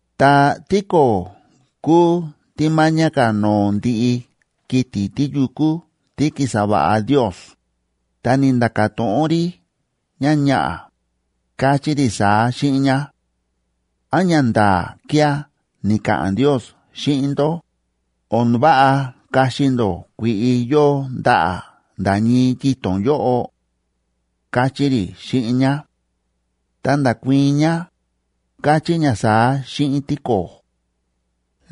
Ta tíko̱o̱ kúu tí máñá ka̱ no̱o̱ ndiꞌi kiti̱ tíyukú tí ki̱sa va̱ꞌa Ndios, ta ni̱nda̱ka̱ to̱ꞌon rí ñáñaꞌa̱, káchí rí saá xíꞌin ñá: ―¿Án ñanda̱a̱ kía̱ ni̱ka̱ꞌa̱n Ndios xíꞌin ndó, o̱n váꞌa kaxi ndó kui̱ꞌi yóo ndaꞌa̱ nda̱ ñii yito̱n yóꞌo? ―káchí rí xíꞌin ñá. Ta nda̱kuii̱n ñá, káchí ñá saá xíꞌin tíko̱o̱: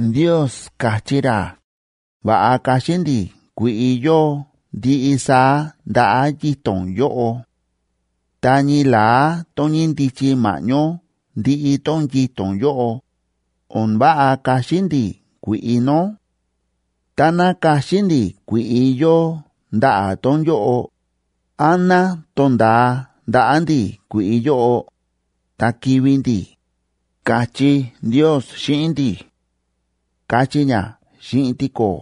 ―Ndios ka̱chí ra va̱ꞌa kaxi ndi̱ kui̱ꞌi yóo ndiꞌi saá ndaꞌa̱ yito̱n yóꞌo. Ta ñii la̱á tón ñíndichi ma̱ꞌñó ndiꞌi tón yito̱n yóꞌo, o̱n váꞌa kaxi ndi̱ kui̱ꞌi nó. Táná kaxi ndi̱ kui̱ꞌi yóo ndaꞌa̱ tón yóꞌo, án ná to̱nda̱a ndaꞌa̱ ndi̱ kui̱ꞌi yóꞌo, ta kivi̱ ndi̱, ka̱chí Ndios xíꞌin ndi̱ ―káchí ñá xíꞌin tíko̱o̱.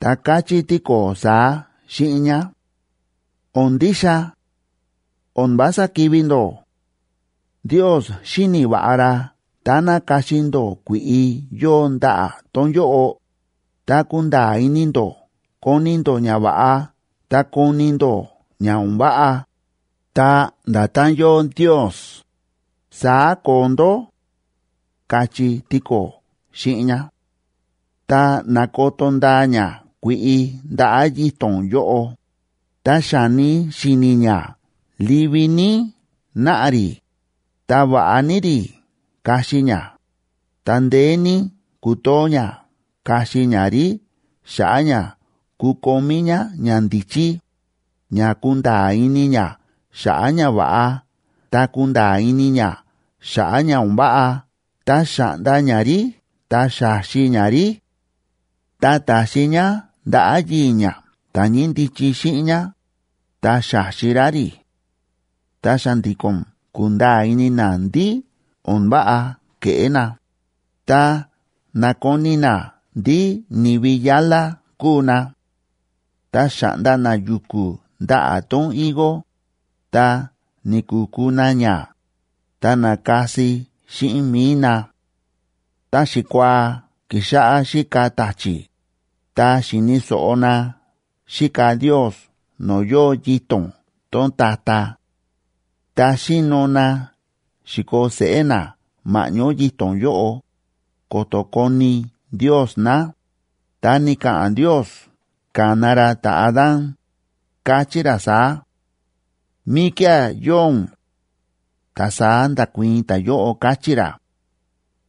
Ta káchí tíko̱o̱ saá xíꞌin ñá: ―¡O̱n ndixa! O̱n vása kivi̱ ndó. Ndios xíni̱ va̱ꞌa ra táná kaxi ndó kui̱ꞌi yóo ndaꞌa̱ tón yóꞌo, ta kunda̱a̱ ini ndó koni̱ ndó ñava̱ꞌa ta koni̱ ndó ña o̱n váꞌa, ta nda̱tán yóo Ndios, saá koo ndó ―káchí tíko̱o̱ xíꞌin ñá. Ta na̱koto ndaa ñá kui̱ꞌi ndaꞌa̱ yito̱n yóꞌo, ta xa̱ni si̱ni̱ ñá livi ní náꞌa rí, ta va̱ꞌa ní rí kaxi ñá, ta ndeé ní kútoo ñá kaxi ñá rí xa̱ꞌa̱ ña kukomí ñá ñandíchí, ña kunda̱a̱ ini ñá xa̱ꞌa̱ ñava̱ꞌa ta kunda̱a̱ ini ñá xa̱ꞌa̱ ña o̱n váꞌa. Ta xa̱ꞌnda ñá rí, ta xa̱xi ñá rí. Ta ta̱xi ñá ndaꞌa̱ yii̱ ñá ta̱ ñíndichi xíꞌin ñá, ta xa̱xi ra rí. Ta xa̱ndi̱ko̱n ku̱nda̱a̱ ini na ndí o̱n váꞌa ke̱ꞌé na, ta na̱koni na ndí ni̱vi yálá kúu na. Ta xa̱ꞌnda na yu̱ku̱ ndaꞌa̱ tón higo, ta ni̱ku̱ku na ña, ta na̱kasi xíꞌin mi̱i na. Ta xikuaa ki̱xáꞌá xíka ta̱chi̱, ta xi̱ni̱ so̱ꞌo na xíka Ndios no̱o̱ yóo yito̱n tón ta̱ta̱; ta xi̱no na xi̱koo seꞌé na ma̱ꞌñó yito̱n yóꞌo, ko̱to̱ koni Ndios na. Ta ni̱ka̱ꞌa̱n Ndiosa ka̱na ra ta̱Adán, káchí ra saá: ―¿Míkía̱ yóo ún? Ta saá nda̱kuii̱n ta̱yóꞌo, káchí ra: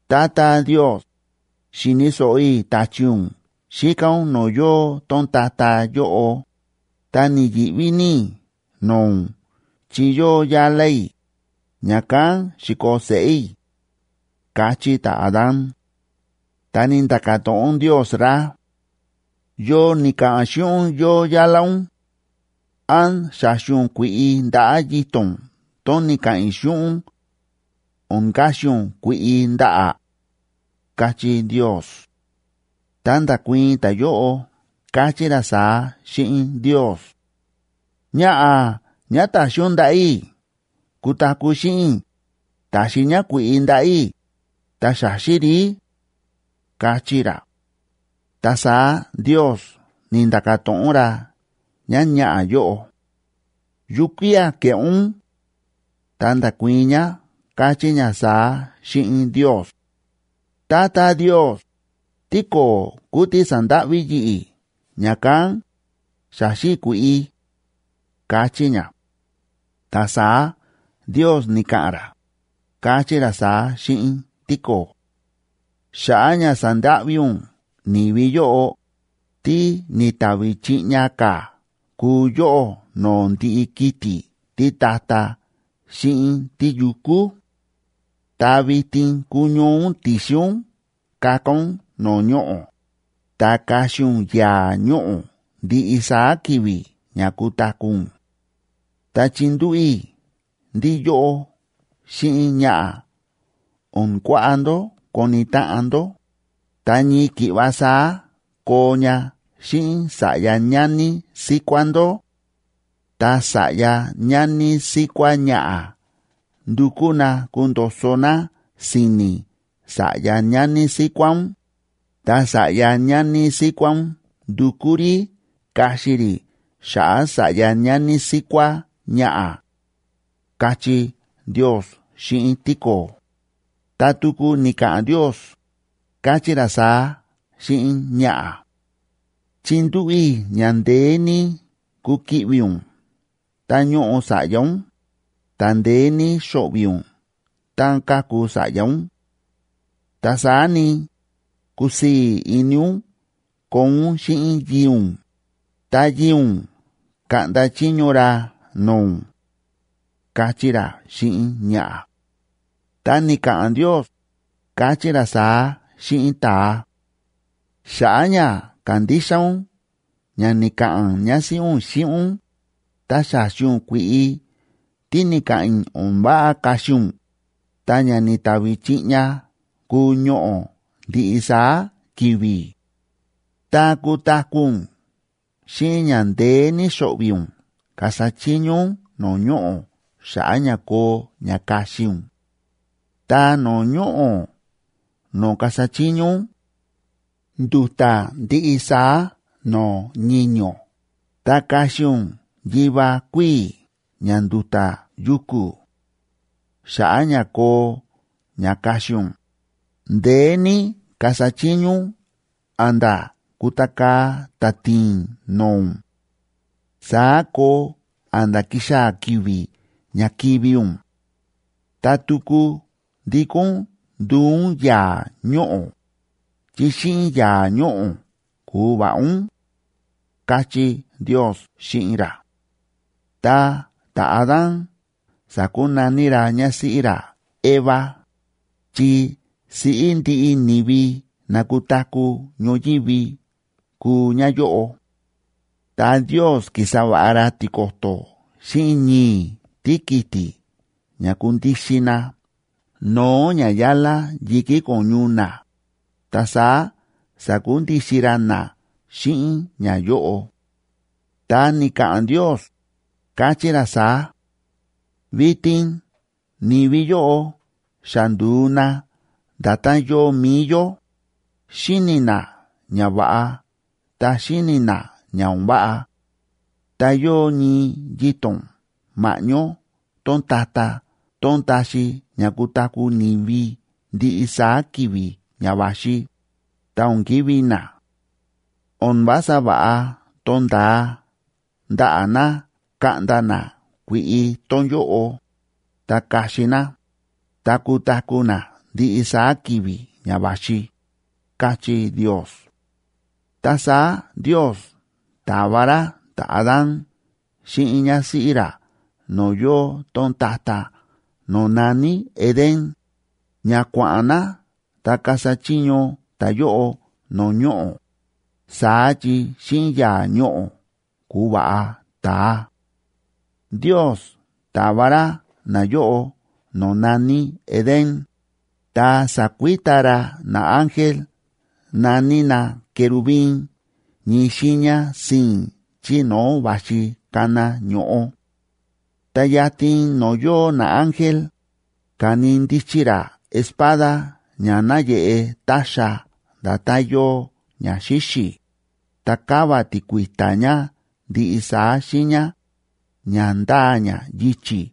―Tata Ndios, xi̱ni̱ so̱ꞌo i̱ ta̱chi̱ ún xíka ún no̱o̱ yóo tón ta̱ta̱ yóꞌo, ta ni̱yi̱ꞌví ní i̱ no̱o̱ ún chi yóo yálá i̱, ña̱kán xi̱koo seꞌé i̱ ―káchí ta̱Adán. Ta ni̱nda̱ka̱ to̱ꞌon Ndios ra: ―¿Yo ni̱ka̱ꞌa̱n xíꞌin ún yóo yálá ún? ¿Án xa̱xi ún kui̱ꞌi ndaꞌa̱ yito̱n tón ni̱ka̱ꞌa̱n i̱ xíꞌin ún, o̱n kaxi ún kui̱ꞌi ndaꞌa̱? ―káchí Ndios. Ta nda̱kuii̱n ta̱yóꞌo, káchí ra saá xíꞌin Ndios: ―Ñaꞌa̱ ñá ta̱xi ún ndaꞌa̱ i̱ kutaku̱ xíꞌin i̱, ta̱xi ñá kui̱ꞌi ndaꞌa̱ i̱, ta xa̱xi i̱ rí ―káchí ra. Ta saá Ndios ni̱nda̱ka̱ to̱ꞌon ra ñáñaꞌa̱ yóꞌo: ―¿Yukía̱ ke̱ꞌé ún? Ta nda̱kuii̱n ñá, káchí ñá saá xíꞌin Ndios: ―Tata Ndios, tíko̱o̱ kúu tí sa̱ndáꞌví yi̱ꞌi̱, ña̱kán xa̱xi i̱ kui̱ꞌi ―káchí ñá. Ta saá Ndios ni̱ka̱ꞌa̱n ra, káchí ra saá xíꞌin tíko̱o̱: Xa̱ꞌa̱ ña sa̱ndáꞌví ún ni̱vi yóꞌo, tí ni̱tavi chiꞌña ka̱ kúu yóꞌó no̱o̱ ndiꞌi kiti̱ títa̱ta̱ xíꞌin tíyukú. Ta vitin kuñoo ún ti̱xin ún kaka ún no̱o̱ ñoꞌo̱, ta kaxi ún yaa̱ ñoꞌo̱ ndiꞌi saá ki̱vi̱ ña kutaku̱ ún. Ta chindúꞌu̱ i̱ ndí yóꞌó xíꞌin ñaꞌa̱ o̱n kuaꞌa ndó koni táꞌan ndó, ta ñii ki̱ꞌva saá koo ña xíꞌin sa̱ꞌya ñani síkuá ndó. Ta sa̱ꞌya ñani síkuá ñaꞌa̱ ndukú na kundo̱so na si̱ni̱ sa̱ꞌya ñani síkuá ún, ta sa̱ꞌya ñani síkuá ún ndukú rí kaxi rí xa̱ꞌa̱ sa̱ꞌya ñani síkuá ñaꞌa̱, káchí Ndios xíꞌin tíko̱o̱. Ta tuku ni̱ka̱ꞌa̱n Ndios, káchí ra saá xíꞌin ñaꞌa̱: Chindúꞌu̱ i̱ ña ndeé ní kukiꞌvi̱ ún tá ñóꞌo sa̱ꞌya ún, ta ndeé ní xo̱ꞌvi̱ ún tá káku sa̱ꞌya ún. Ta saá ni, kusii̱ ini ún koo ún xíꞌin yii̱ ún, ta yii̱ ún kaꞌnda chiño ra no̱o̱ ún, káchí ra xíꞌin ñaꞌa̱. Ta ni̱ka̱ꞌa̱n Ndios, káchí ra saá xíꞌin ta̱a: Xa̱ꞌa̱ ña ka̱ndixa ún ña ni̱ka̱ꞌa̱n ñásíꞌí ún xíꞌin ún, ta xa̱xi ún kui̱ꞌi tí ni̱ka̱ꞌa̱n i̱ o̱n váꞌa kaxi ún, ta ña ni̱tavi chiꞌña kúu ñoꞌo̱ ndiꞌi saá ki̱vi̱. Ta kutaku̱ ún xíꞌin ña ndeé ní xo̱ꞌvi̱ ún kasa chiño ún no̱o̱ ñoꞌo̱ xa̱ꞌa̱ ña koo ña kaxi ún. Ta no̱o̱ ñoꞌo̱ no̱o̱ kasa chiño ún, ndu̱ta̱ ndiꞌi saá no̱o̱ ñiño̱, ta kaxi ún yiva kuíi̱ ña ndu̱ta̱ yu̱ku̱. Xa̱ꞌa̱ ña koo ña kaxi ún, ndeé ní kasa chiño ún a̱nda̱ kutakaa̱ táti̱i̱n no̱o̱ ún. Saá koo a̱nda̱ kixaa̱ ki̱vi̱ ña kivi̱ ún, ta tuku ndikó ún nduu ún yaa̱ ñoꞌo̱, chi xíꞌin yaa̱ ñoꞌo̱ ku̱va̱ꞌa ún, káchí Ndios xíꞌin ra. Ta ta̱Adánb sa̱kunaní ra ñásíꞌí ra Eva,c chi siꞌí ndiꞌi ni̱vi na kutaku̱ ñoyívi kuu ñáyóꞌo. Ta Ndios ki̱sa va̱ꞌa ra tiko̱to̱ xíꞌin ñii̱ tíkiti̱ ña kundixin na no̱o̱ ñayálá yi̱kí ko̱ñu na, ta saá sa̱kundixin ra na xíꞌin ñayóꞌo. Ta ni̱ka̱ꞌa̱n Ndios, káchí ra saá: “Vitin ni̱vi yóꞌo xa ndu̱u na nda̱tán yóo mi̱i yó, xíni̱ na ñava̱ꞌa ta xíni̱ na ña o̱n váꞌa. Ta yóo ñii yito̱n ma̱ꞌñó tón ta̱ta̱ tón taxi ña kutaku̱ ni̱vi ndiꞌi saá ki̱vi̱ ña va̱xi, ta o̱n kivi̱ na. O̱n vása va̱ꞌa to̱nda̱a ndaꞌa̱ na kaꞌnda na kui̱ꞌi tón yóꞌo, ta kaxi na, ta kutaku̱ na ndiꞌi saá ki̱vi̱ ña va̱xi”, káchí Ndios. Ta saá Ndios ta̱va ra ta̱Adán xíꞌin ñásíꞌí ra no̱o̱ yóo tón ta̱ta̱ no̱o̱ na̱ní Edén, ña kua̱ꞌa̱n na ta kasa chiño ta̱yóꞌo no̱o̱ ñoꞌo̱, saá chi xíꞌin yaa̱ ñoꞌo̱ ku̱va̱ꞌa ta̱a. Ndios ta̱va ra nayóꞌo no̱o̱ na̱ní Edén, ta sa̱kuita ra naángel na̱ní na querubín ñii xiiña sii̱n chí no̱o̱ va̱xi kana ño̱ꞌo. Ta yatin no̱o̱ yóo naángel, ka̱ni ndichi ra espada ña náyeꞌe táxa nda̱tán yóo ña xíxi̱, ta káva tíkui̱ta̱ ña ndiꞌi saá xiiña, ña ndáa ña yichi̱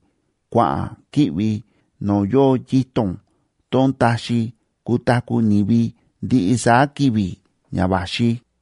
kua̱ꞌa̱n ki̱ꞌvi no̱o̱ yóo yito̱n tón taxi kutaku̱ ni̱vi ndiꞌi saá ki̱vi̱ ña va̱xi.